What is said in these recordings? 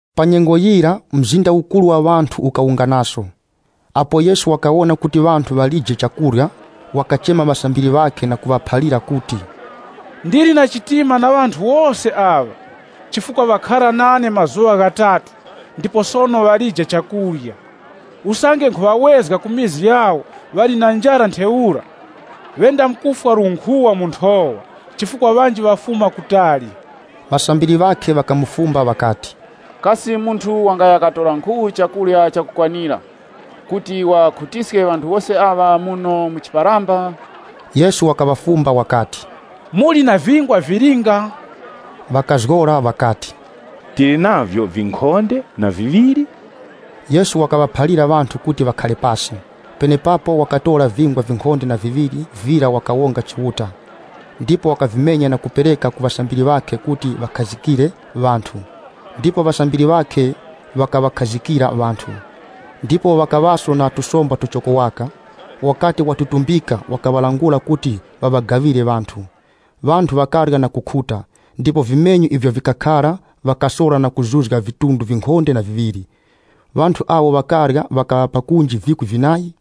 Pa nyengo yira, mzinda ukuru wa ŵanthu ukawunganaso. Apo Yesu wakawona kuti ŵanthu ŵalije chakurya, wakachema ŵasambiri ŵakhe na kuŵaphalira kuti, “Ndili nawo na chiwuravi ŵanthu wose aŵa, chifukwa ŵakhara nane mazuŵa ghatatu ndipo sono ŵalije chakurya. Usange nkhuŵawezga ku mizi yawo ŵali na njara ntheura, ŵendamkufwa lunkhuŵa mu nthowa, chifukwa ŵanji ŵafuma kutali.” Ŵasambiri ŵakhe ŵakamufumba ŵakati, “Kasi munthu wangaya katora nkhu chakurya chakukwanira kuti waŵakhutiske ŵanthu wose aŵa muno mu chiparamba?” Yesu wakaŵafumba wakati, “Muli na vingwa vilinga?” Ŵakazgora ŵakati, “Tili navyo vinkhonde na viŵiri.” Yesu wakaŵaphalira ŵanthu kuti ŵakhare pasi. Penepapo wakatora vingwa vinkhonde na viŵiri vira wakawonga Chiuta, ndipo wakavimenya na kupereka ku ŵasambiri ŵakhe kuti ndiwo ŵaŵakharikire ŵanthu. Ndipo ŵasambiri ŵakhe ŵakaŵakharikira ŵanthu. Ndipo ŵakaŵaso na tusomba tuchoko waka. Wakati watutumbika wakaŵalangula kuti ŵaŵagaŵire ŵanthu. Ŵanthu ŵakarya na kukhuta, ndipo vimenyu ivyo vikakhara ŵakasora na kuzuzga vidunga vinkhonde na viŵiri. Ŵanthu awo ŵakarya ŵakaŵa pakunji vikwi vinayi.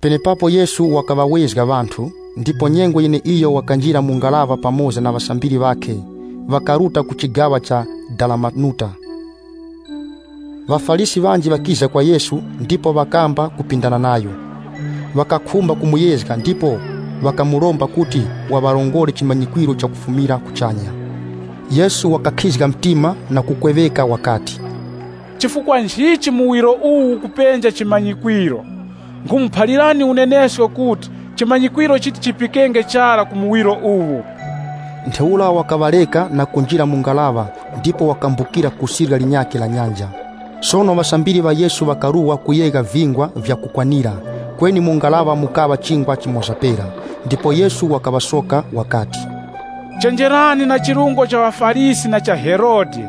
Penepapo Yesu wakaŵawezga ŵanthu, ndipo nyengo yeneiyo wakanjira mu ngaraŵa pamoza na ŵasambiri ŵakhe, ŵakaruta ku chigaŵa cha Dalamanuta. ŴaFarisi ŵanji ŵakiza kwa Yesu ndipo ŵakamba kupindana nayo. Ŵakakhumba kumuyezga ndipo ŵakamuromba kuti waŵarongore chimanyikwiro chakufumira kuchanya. Yesu wakakhizga mtima na kukweŵeka wakati, “Chifukwa nchichi muwiro uwu ukupenja chimanyikwiro? Nkhumuphalirani unenesko kuti, chimanyikwiro chiti chipikenge chara ku muwiro uwu!” Ntheura wakaŵareka na kunjira mu ngaraŵa ndipo wakambukira ku sirya linyakhe la nyanja. Sono ŵasambiri ŵa Yesu ŵakaruwa kuyegha vingwa vya kukwanira, kweni mu ngaraŵa mukaŵa chingwa chimoza pera. Ndipo Yesu wakaŵachenjezga wakati, “Chenjerani na chirungo cha ŵaFarisi na cha Herode.”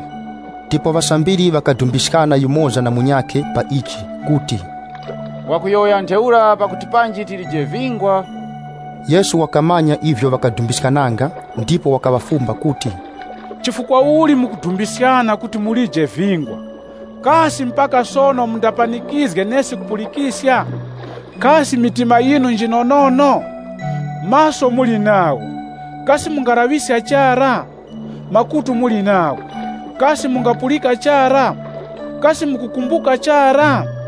Ndipo ŵasambiri ŵakadumbiskana yumoza na munyakhe pa ichi kuti, “Wakuyowoya ntheura pakuti panji tilije vingwa?” Yesu wakamanya ivyo ŵakadumbiskananga, ndipo wakaŵafumba kuti, “Chifukwa uli mukudumbiskana kuti mulije vingwa? Kasi mpaka sono mundapanikizge nesi kupulikiska? Kasi mitima yinu njinonono? Maso muli nagho, kasi mungalaŵiska chara? Makutu muli nagho, kasi mungapulika chara? Kasi mukukumbuka chara?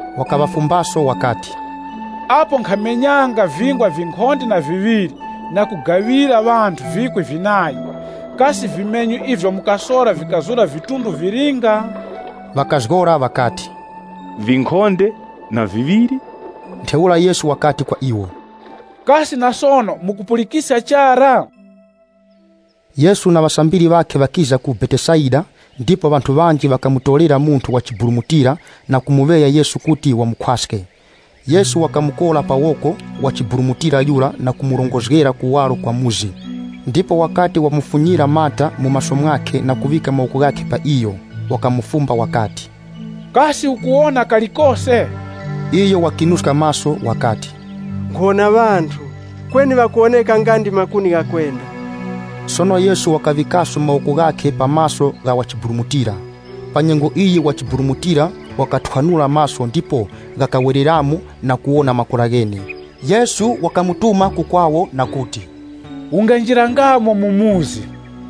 Wakaŵafumbaso wakati, “Apo nkhamenyanga vingwa vinkhonde na viŵiri na kugaŵira ŵanthu vikwi vinayi, kasi vimenyu ivyo mukasora vikazura vidunga vilinga?” Ŵakazgora ŵakati, “Vinkhonde na viŵiri.” Ntheura Yesu wakati kwa iwo, “Kasi na sono mukupulikiska chara?” Yesu na ŵasambiri ŵakhe ŵakiza ku Betesaida, ndipo ŵanthu ŵanji ŵakamutorera munthu wa chiburumutira na kumuŵeya Yesu kuti wamukhwaske. Yesu wakamukora pa woko wa chiburumutira yura na kumurongozgera kuwaro kwa chikaya. Ndipo wakati wamufunyira mata mu maso mwakhe na kuŵika mawoko ghakhe pa iyo, wakamufumba wakati, “Kasi ukuwona kalikose?” Iyo wakinuska maso wakati, “Nkhuwona ŵanthu, kweni ŵakuwoneka nga ndi makuni ghakwenda.” Sono Yesu wakaŵikaposo mawoko ghakhe pa maso gha wachiburumutira. Pa nyengo iyi wachiburumutira yura wakathwanula maso ndipo maso ghakhe ghakawereramo na kuwona makora ghene. Yesu wakamutuma ku kwakhe, wakati na kumuphalira kuti, “Unganjirangamo mu chikaya chara.”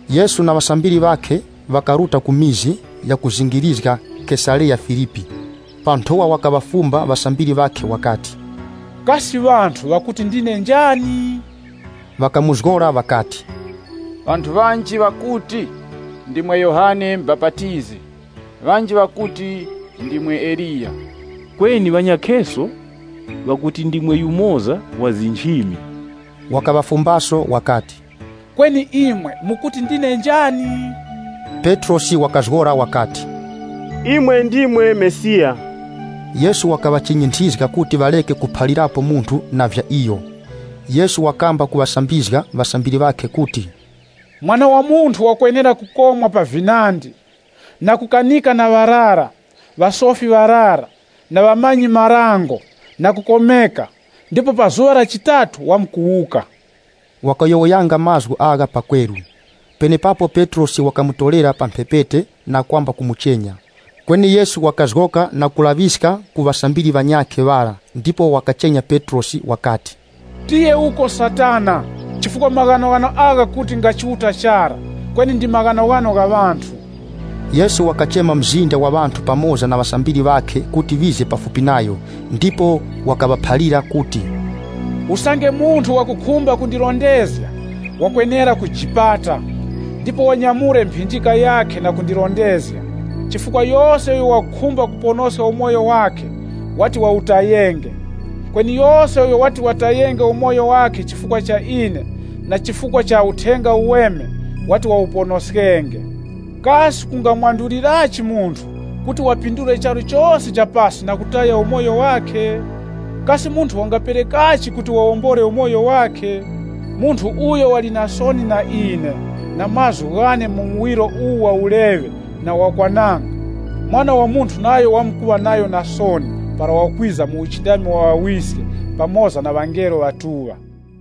Yesu na ŵasambiri ŵakhe ŵakaruta ku mizi yakuzingirizga Kesareya-Filipi. Pa nthowa wakaŵafumba ŵasambiri ŵakhe wakati, “Kasi ŵanthu ŵakuti ndine njani?” Ŵakamuzgora ŵakati, “Ŵanthu ŵanji ŵakuti, ndimwe Yohane Mubapatizi, ŵanji ŵakuti ndimwe Eliya, kweni ŵanyakheso ŵakuti, ndimwe yumoza wa nchimi.” Wakaŵafumbaso wakati, “Kweni imwe mukuti ndine njani?” Petrosi wakazgora wakati, “Imwe ndimwe Mesiya.” Yesu wakaŵachinyinthizga kuti ŵareke kuphalirapo munthu na vya iyo. Yesu wakamba kuŵasambizga ŵasambiri ŵakhe kuti, “Mwana wa Munthu wakwenera kukomwa pa vinandi na kukanika na ŵarara, ŵasofi ŵarara, na ŵamanyi-marango na kukomeka ndipo pa zuŵa la chitatu wamkuwuka.” Wakayowoyanga mazgu agha pakweru. Penepapo Petrosi wakamutorera pa mphepete na kwamba kumuchenya. Kweni Yesu wakazgoka na kulaŵiska ku ŵasambiri ŵanyakhe ŵara ndipo wakachenya Petrosi wakati, “Tiye uko Satana! Chifukwa maghanoghano agha kuti nga Chiuta chara, kweni ndi maghanoghano gha ŵanthu.” Yesu wakachema mzinda wa ŵanthu pamoza na ŵasambiri ŵakhe kuti ŵize pafupi nayo, ndipo wakaŵaphalira kuti, “Usange munthu wakukhumba kundirondezga, wakwenera kujipata, ndipo wanyamule mphinjika yakhe na kundirondezga. Chifukwa yose uyo wakukhumba kuponoska umoyo wakhe wati wawutayenge, kweni yose uyo wati watayenge umoyo wakhe chifukwa cha ine na chifukwa cha Uthenga Uweme wati wawuponoskenge. Kasi kungamwandulirachi munthu kuti waphindule charu chose cha pasi na kutaya umoyo wakhe? Kasi munthu wangaperekachi kuti wawombole umoyo wakhe? Munthu uyo wali na soni na ine na mazgu ghane mu muwiro uwu wa uleŵe na wakwananga, Mwana wa Munthu nayo wamkuŵa nayo na soni para wakwiza mu uchindami wa Ŵawiske pamoza na ŵangelo ŵatuŵa.”